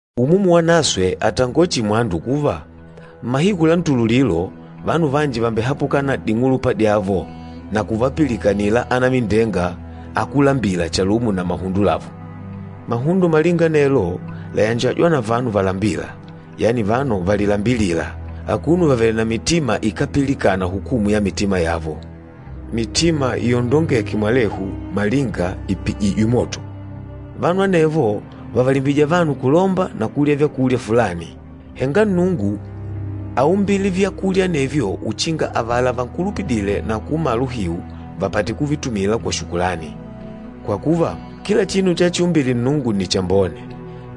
Umumu Wanaswe àtangola chihi mwandu kuva, mmahiku la ntululilo, vanu vanji vàmbehapukana na ding'ulupa dyavo na kuvapilikanila anamindenga akúlambila chalumo na mahundo lavo. Mahundo malinga anelo làyanjajwa na vanu valambîla, yani vanu valilambilîla, akuno vavèlè na mitima ikápilikana hukumu ya mitima yavo, mitima yondongêke mwalehu malinga ìpijijwe moto. Vanu anevo vàvalimbija vanu kulomba na kulya vyakulya fulani. Henga Nnungu áumbile vyakulya anevyo uchinga avala vankulupidîle na kuumala uhiu, vapate kuvitumila kwa shukulani. Kwa kuva, kila chinu chachiumbile Nnungu nni chambone,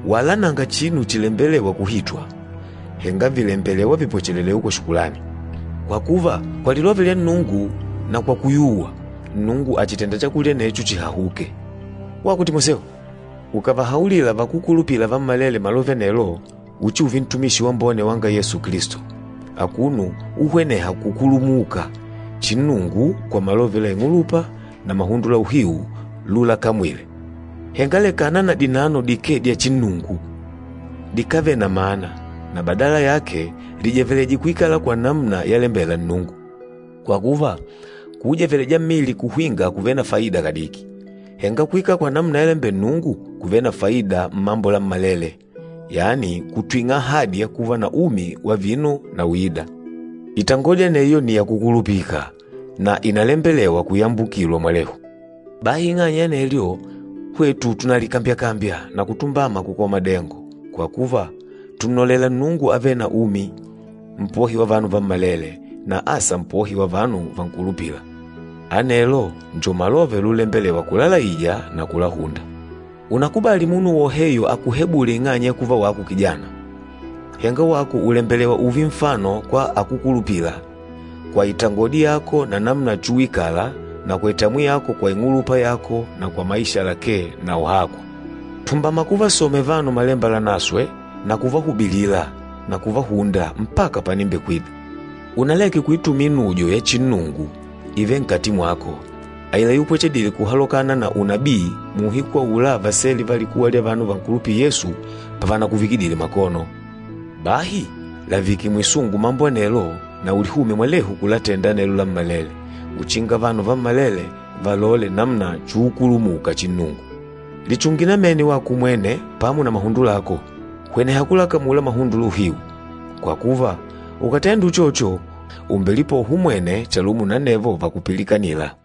wala nanga chinu chilembelewa kuhitwa, henga vìlembelewa vipwechelewe kwa shukulani. Kwa kuva, kwa lilove lya Nnungu na kwa kuyuwa, Nnungu àchitenda chakulya anecho chihahuke. Wako Timoseo, ukàvahaulila vakúkulupila vammalele malove anelo, uchiuve ntumishi wambone wanga Yesu Kilisto, akuno uhweneha kukulumuka chinnungu kwa malove la ing'ulupa na mahundo la uhiu lulakamwile. Henga lekana na dinano dikee dya chinnungu, dikávele na mana, na badala yake lijeveleje kuikala kwa namuna yalembela Nnungu. “Kwa kuva, kuujeveleja mmili kuhwinga kùvele na faida kadiki, henga kuikala kwa namuna yalembela Nnungu kùvele na faida mmambo lammalele, yani kùtwing'a ahadi ya kuva na umi wa vino na uîda.” Itangodi aneyo nni yakukulupika, na ìnalembelewa kuyambukilwa mwalehu. Bahi ing'anya ya anelyo, hwetu tùnalikambyakambya na kutumbama kukola madengo, kwa kuva, tùnnolela Nnungu avêle na umi, Mpohi wa vanu vammalele, na asa Mpohi wa vanu vankulupîla. Anelo njo malove lulembelewa kulalaija na kulahunda. Unakubàlì munu woheyo akuhebule ing'anya ya kuva wako kijana. Henga wako ùlembelewa ùùve nfano kwa akúkulupila, kwa itangodi yako na namuna chuwikala na kwa itamwi yako kwa ing'ulupa yako na kwa maisha lakee na uhakwa. Tumbama kuvasomela vanu Malemba Lanaswe na kuvahubilila na kuvahunda, mpaka panimbekwida. Unaleke kuitumila inudyo ya chinnungu ivêle nkati mwako, aila yupwechedile kuhalokana na unabii muuhiku aula vasele va likuwa lya vanu vankulupîla Yesu pavanakuvikidile makono. Bahi lavike mwisungu mambo anelo na ulihumye mwalehu kulatenda anelo lammalele uchinga vanu vammalele valole namuna chuukulumuka chinnungu. Lichunge namene wako umwene pamo na mahundo lako. Hweneha kulakamula mahundo la uhiu, kwa kuva, ukàtenda uchocho, ùmbelipoha umwene chalumo na anevo vakupilikanîla.